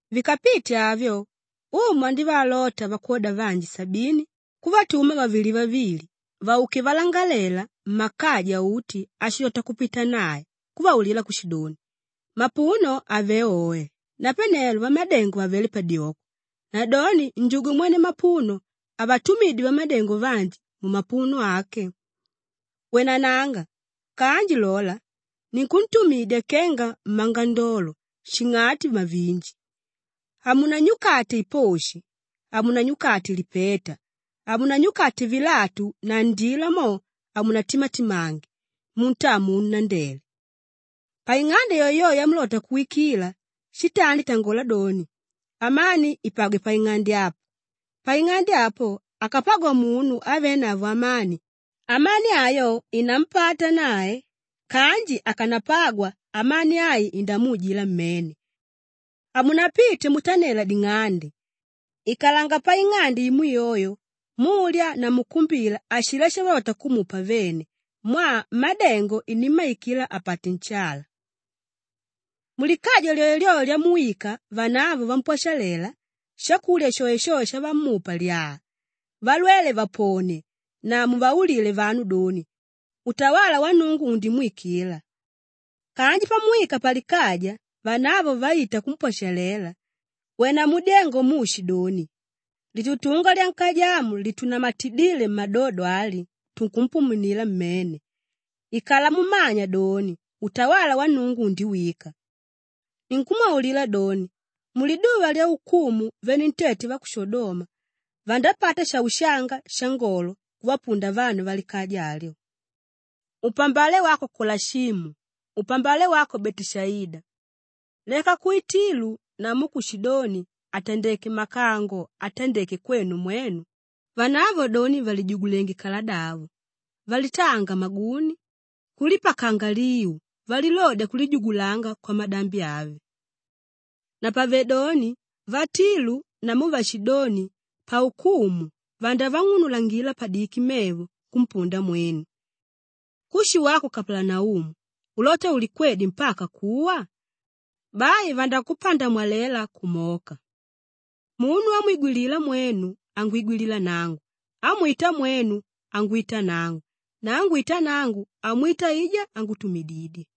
Vikapite avyo, Umu andívaalota vakwoda vanji sabini kuvatuma vavili vavili vauke valangalela mmakaja uti ashilota kupita nae kuvaulila kushidoni, “Mapuno avelé oe napane vamadengo vavelé padyoko nadoni njugwe mwene mapuno avatumidye vamadengo vanji mumapuno ake. Wenananga! Kanji lola, ninkuntumidya kenga mmangandolo shing'ati mavinji. Hamunanyukate iposhi, hamunanyukate lipeta, hamunanyukate vilatu na ndila mo, hamunatimatimange muntaa munu nandele. Paing'ande yoeyoe yamulota kuwikila, shitandi tangola doni, ‘Amani ipagwe paing'ande apa.’ Paing'ande apo, akapagwa munu ávenavo amani, amani ayo inampata nae kanji akanapagwa, amani ai indamuujila mmene. Hamunapite mutanela ding'ande. Ikalanga paing'ande imo yoyo mulya na mukumbila ashilá shavalota kumupa vene mwaa mmádengo inimmaikila apate nshala. “Mulikaja lyoelyoe lyamuwika vanavo vampwashalela, shakulya shoeshoe shavamupa lyaa, valwele vaponie na muvaulile vanu doni, ‘Utawala wa Nnungu undimwikila.’ Kanji pamuwika palikaja vanavo vaita kumpwashalela, wena mudyengo muushidoni, ‘Litutunga lyankaja amu litunamatidíle mmadodo ali, tunkumpumunila mmene. Ikala mumanya doni, utawala wa Nnungu undiwika.’ Ninkumwaulila doni, muliduva lyaukumu venentete va ku Shodoma vandapata shaushanga shaangolo kuvapunda vanu valikaja alyo. Upambale wako Kolashimu! Upambale wako Beteshaida! Leka ku Tilu namu ku Shidoni àtandeke makango atandéke kwenu mwenu, vanavo doni vàlijugulenge kaladavo, valitaanga maguni, kulipakanga liu valilodya kulijugulanga kwamadambi ave. Napavedoni, vatilu namu vashidoni paukumu vandavang'unulangila padiki mevo kumpunda mwenu. Kushi wako Kapalanaumu, ulota ulikwedye mpaka kuwa? Bai vandakupandamwalela kumoka. “Munu ámwigwilila mwenu angwigwilila nangu, ámwita mwenu angwita nangu na ángwita nangu, amwita aijá ángutumididye.”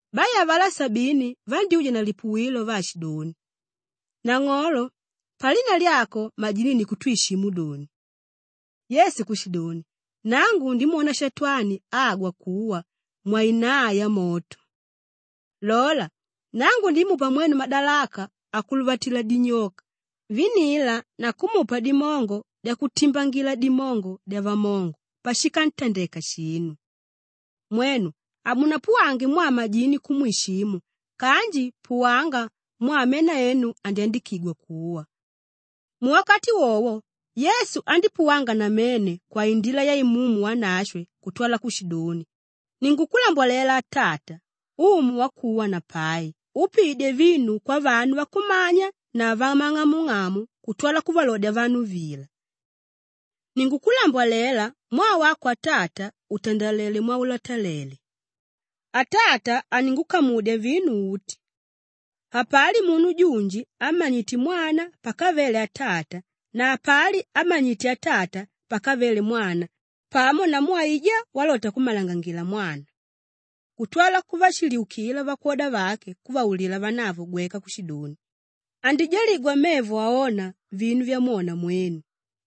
Bai avalá sabini vandyúja na lipuwilo vaashidoni, “Nang'olo, palina lyako majini ni kutwishimu doni.” Yesu kushidoni, “Nangu ndimwona Shatwani agwa kuwa mwainaa yamoto. Lola, nangu ndimupa mwenu madalaka akuluvatila dinyoka, vinila na kumupa dimongo dyakutimbangila dimongo dyavamongo pashikantandeka shinu. Mwenu hamunapuwange mwaa majini kumwishimu kanji puwanga mwaa mena enu andyandikigwa kuwa.” Muwakati wowo, Yesu andípuwanga namene kwaindila ya Imumu Wanashwe kutwala kushidoni, “Ninkukulambwalela Atata, Umu wakuwa na pai úpiidye vinu kwavanu vakumanya na vamang'amung'amu kutwala kuvalodya vanu vila. Ninkukulambwalela mwaa wako Atata utandalelé mwaulotalele. Atata aningukamudya vinu uti. Hapali munu junji ámmanyite Mwana pakavele Atata na hapali ámmanyite Atata pakavele Mwana pamo namu aijá walota kummalangangila Mwana.” Kutwala kuvashiliukila vakwoda vake kuvaulila vanavo gweka kushidoni, “Andijaligwa mevo aóna vinu vyamwona mwenu.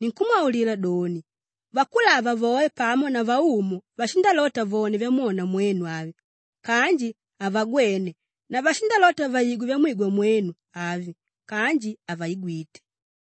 Ninkumwaulila doni, vakulava voe pamo na vaumu vashindalota vone vyamwona mwenu avi kanji havagwene na vashindalota vaigwe vyamwigwa mwenu avi kanji havaigwite.”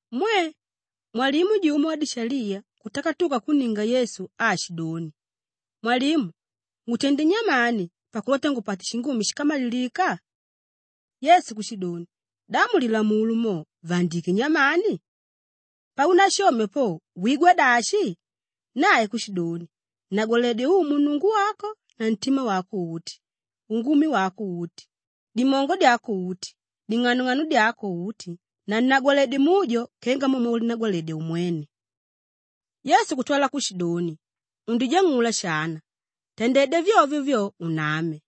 Mwe! Mwalimu jumo wadishaliya kutakatuka kunninga Yesu aashidoni, “Mwalimu, Ngutendé nyamani pakulota ngupate shingumi shíkamalilika?” Yesu kushidoni, “Da mu Lilamulo mo, vaandiké nyamani? Paunashomya po wigwa dashi?” Nae kushidoni, “Nnagwaledye Umu Nnungu wako na ntima wako uti, ungumi wako uti, dimongo dyako uti, ding'anong'ano dyako uti na nnagwaledye mujo kenga mo mwaulinagwaladyedya umwene.” Yesu kutwala kushidoni, “Undijang'ula shana. Tandedya vyovyo vyo, uname.”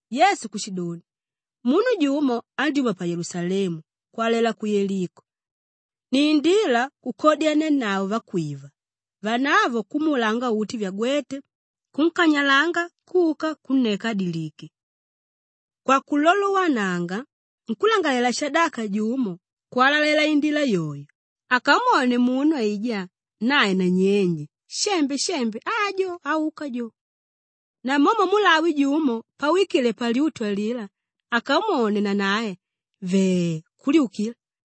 Yesu kushidoni, “Munu jumo andyúma pa Yelusalemu kwalalela ku Yeliko; nindila kukodyanianavo vakwiva, vanavo kumuulanga uti vyagwéte, kunkanyalanga kuka kunneka àdilike. Kwakulolowananga nkúlangalalela-shadaka jumo kwalalela indila yoyo; akamwone munu aijá, nae nanyenje, shembe, shembe, ajo áuka jo. Namomo mulawi jumo pawikile palyutu alilá akamwone, nanae, vee, kulyukila.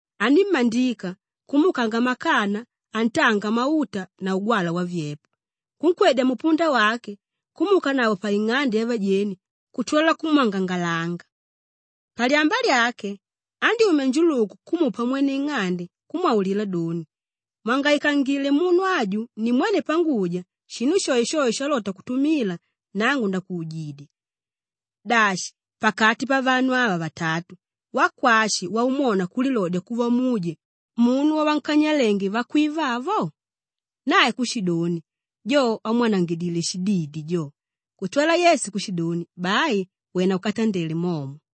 Anímmandika kumuukanga makana atanga mauta na ugwalwa wavyepo, kunkwedya mupunda wake kumuukanavo paing'ande yavajeni kutwala kumwangangalanga. Palyamba lyake, andyúmya njuluku kumupa mwene ing'ande kumwaulila doni, ‘Mwangaikangile munu aju nimwene panguja shinu shoeshoe shalota kutumila, nangu ndakuujidya.’ Dashi, pakati pavanu ava vatatu, wakwashi waumwona kulilodya kuva muje munu wavankanyalénge vakwiva avo?” Nae kushidoni, “Jo ámwanangidile shididi jo.” Kutwala Yesu kushidoni, “Bai wena ukatandele momo.”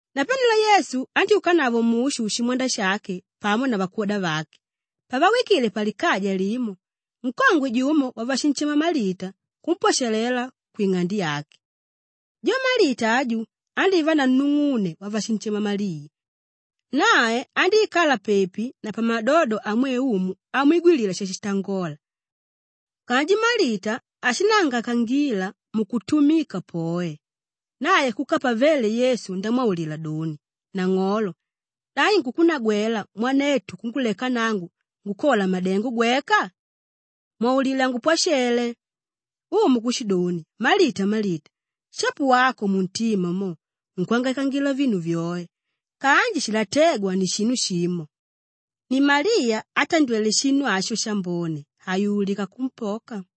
Napanelo Yesu andyúkanavo mushu shimwanda shake pamo na vakwoda vake. Pavawikile palikaja limo, nkongwe jumo wavashinshema Malita kumpwashalela kwing'ande yake. Jo Malita aju, andívanavo nung'une wavashinshema Maliya. Nae andíikala pepi na pamadodo amwe Umu amwigwilila shashitangola. Kanji Malita ashinangaikangila mukutumika poe; nae kuka pavele Yesu ndamwaulila doni, “Nang'olo! Da inkukunagwela mwanetu kunguleka nangu ngukola madengo gweka? Mwaulile angupwashele!” Umu kushidoni, “Malita, Malita, shapo wako muntima mo unkwangaikangila vinu vyoe kanji shilatégwa ni shinu shimo. Ni Maliya átandwele shinu asho shambone, hayululika kumpoka.”